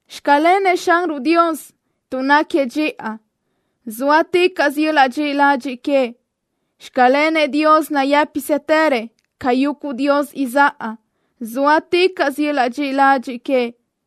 ¡Xclenëʼ Xanruʼ Dios tuʼ náquiëʼ dxiʼa! Zóaticaʼsö yöl-laʼ dxiʼi ladxiʼ queëʼ. ¡Xclenëʼ Dios nayë́pisëtërëʼ ca yuguʼ dios izáʼa! Zóaticaʼsö yöl-laʼ dxiʼi ladxiʼ queëʼ.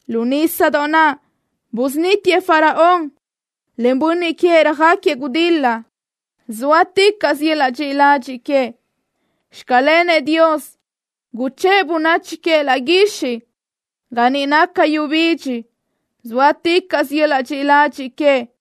¡Lu nísadoʼ naʼ busunítiëʼ Faraón, en bönniʼ queëʼ röjáquiëʼ gudil-la! Zóaticaʼsö yöl-laʼ dxiʼi ladxiʼ queëʼ. ¡Xclenëʼ Dios, guchë́ʼë bönachi queëʼ laʼ guixiʼ ga niʼ naca yu bidxi! Zóaticaʼsö yöl-laʼ dxiʼi ladxiʼ queëʼ.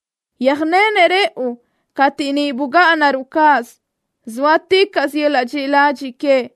¡Yöjnenëʼ rëʼu cateʼ niʼ bugáʼanaruʼ cáʼasö! Zóaticaʼsö yöl-laʼ dxiʼi ladxiʼ queëʼ.